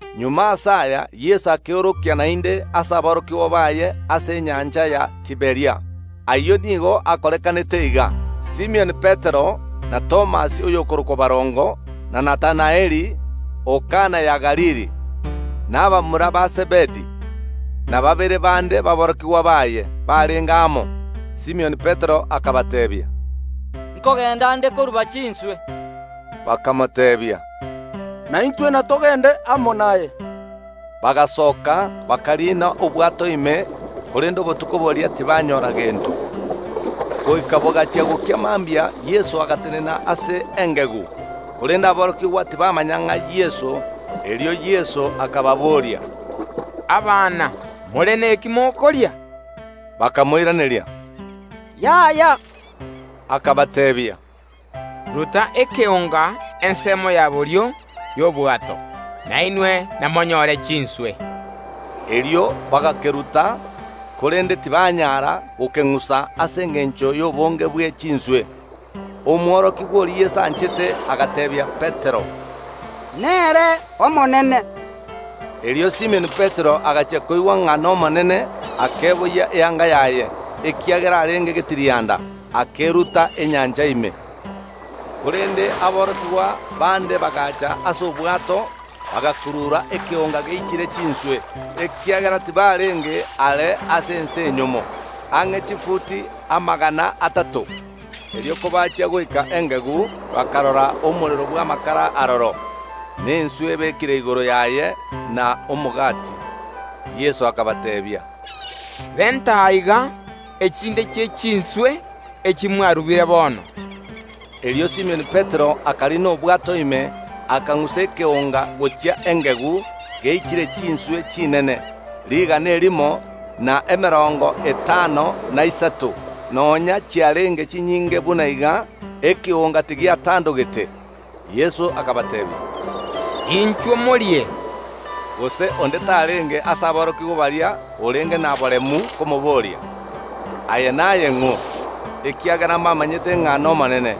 Magega ase aya Yeso akeorokia naende ase aborokigwa baye ase enyancha ya Tiberia. Ayio nigo akorekanete iga: Simioni Petero, na Thomas oyokorokwa Barongo, na Natanaeli o Kana ya Galili, na abamura ba Zebedi, na babere bande baborokigwa baye barenge amo. Simioni Petero akabateebia, “Nkogenda nde koruba chinswe.” Bakamoteebia, “Naintwe natogende amo naye.” Bagasoka, bakariina obwato ime, korende obotuko boria tibanyora gento. Goika bogachia gokia mambia, Yeso agatenena ase engegu, korende aborokigwa tibamanya ng’a n’Yeso. Erio Yeso akababoria, “Abana, more neki mokoria?” Bakamoiraneria, “Yaya.” Akabateebia, “Ruta ekeonga ensemo ya borio y’obwato, na inwe namonyore chinswe.” Erio bagakeruta, korende tibanyara gokeng’usa ase engencho y’obonge bwe chinswe. Omworokigwa oria Yeso anchete agateebia Petero, “Nere Omonene.” Erio Simioni Petero, agachia koigwa ng’a n’Omonene, akeboyia eanga yaye (ekiagera arenge getirianda), akeruta enyancha ime. Korende aborokigwa bande bagacha ase obwato, bagakurura ekeonga geichire chinswe, ekiagera tibarenge are ase ense enyomo, ang’e chifuti amagana atato. Erio kobachia goika engegu, bakarora omorero bw’amakara aroro, na enswe ebekire igoro yaye, na omogati. Yeso akabateebia, “Renta aiga echinde chie chinswe echi mwarubire bono.” Erio Simioni Petero akariina obwato ime, akang’usa ekeonga gochia engegu geichire chinswe chinene, rigana erimo, na emerongo etano, na isato; nonya chiarenge chinyinge buna iga, ekeonga tigiatandogete. Yeso akabateebia, “Inchuo morie!” Gose onde tarenge ase aborokigwa baria orenge na boremu komoboria, “Aye naye ng’o?” Ekiagera mbamanyete ng’a n’Omonene.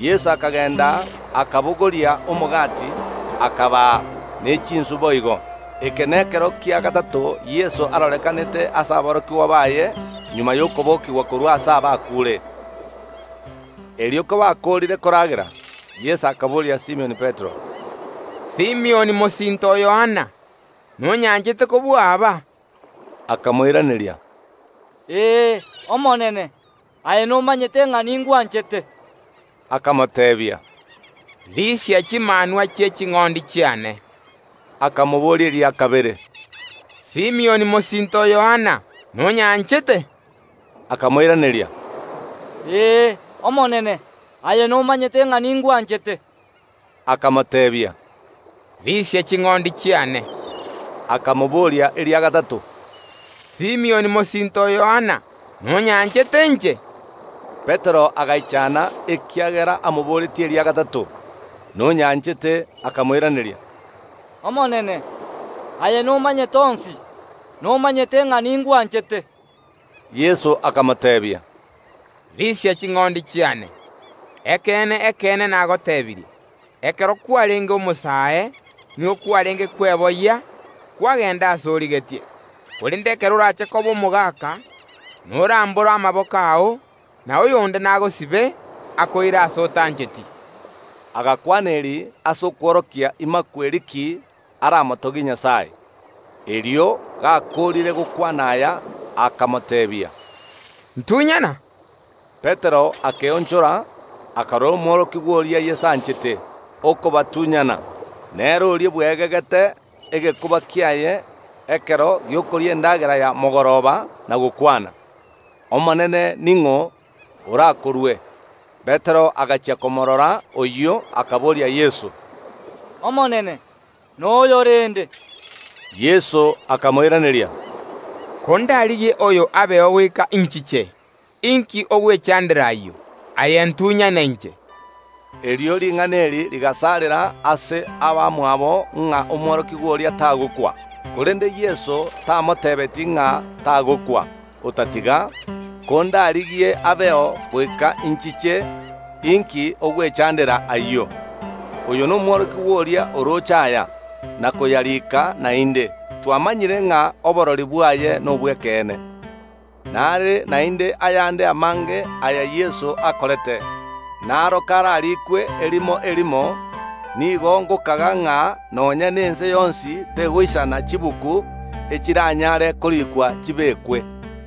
Yeso akagenda akabogoria omogati, akabaa, ne chinswe boigo. Eke nekero kia gatato Yeso arorekanete ase aborokigwa baye magega y’okobokigwa korwa ase abakuure. Erio kobakoorire koragera, Yeso akaboria Simioni Petero, “Simioni mosinto o Yohana, nonyanchete kobua aba?” Akamoiraneria, “Ee, Omonene, aye nomanyete ng’a ningwanchete.” Akamoteebia, “Risia chimanwa chi’eching’ondi chiane.” Akamoboria eria kabere, “Simioni mosinto o Yohana, nonyanchete?” Akamoiraneria, “Ee, Omonene, aye nomanyete ng’a ningwanchete.” Akamoteebia, “Risia ching’ondi chiane.” Akamoboria eria gatato, “Simioni mosinto o Yohana, nonyanchete inche?” Petero agaichana ekiagera amoboretie eria gatato, “Nonyanchete?” Akamoiraneria, “Omonene, aye nomanyete onsi, nomanyete ng’a ningwanchete.” Yeso akamoteebia, “Risia ching’ondi chiane. Ekeene, ekeene, nagotebirie: Ekero kwarenge omosae, nigo kwarenge kweboyia, kwagenda aase origetie, korende ekero orache koba omogaka, norambore amaboko ao, na oyonde nagosibe, akoire aase otancheti.” (Agakwana eri ase okworokia imakweri ki aramotogie Nyasae). Erio gakoorire gokwana aya, akamoteebia, “Ntunyana?” Petero akeonchora, akarora omworokigwa oria Yeso anchete okobatunyana; nere oria bweegegete egekuba kiaye ekero gi’okoria endagera ya mogoroba na gokwana, “Omonene, ning’o orakorue?” Petero agachia komoorora oyio, akaboria Yeso, “Omonene, noyo rende?” Yeso akamoiraneria, “Kondarigie oyo abeo goika inchiche, inki ogwechandera ayio? Aye ntunyane inche.” Erio ring’ana eri rigasarera ase abamwabo ng’a omworokigwa oria tagokwa, korende Yeso tamotebetie ng’a tagokwa, otatiga, “Kondarigie abeo goika inchiche, inki ogwechandera ayio?” Oyo nomworokigwa oria orooche aya, na koyarika, naende twamanyire ng’a oborori bwaye nobw’ekeene. Nare naende ayande amange aya Yeso akorete; naro kararikwe erimo erimo, nigo ngokaga ng’a nonya nense yonsi tegoisana chibuku echiranyare korikwa chibekwe.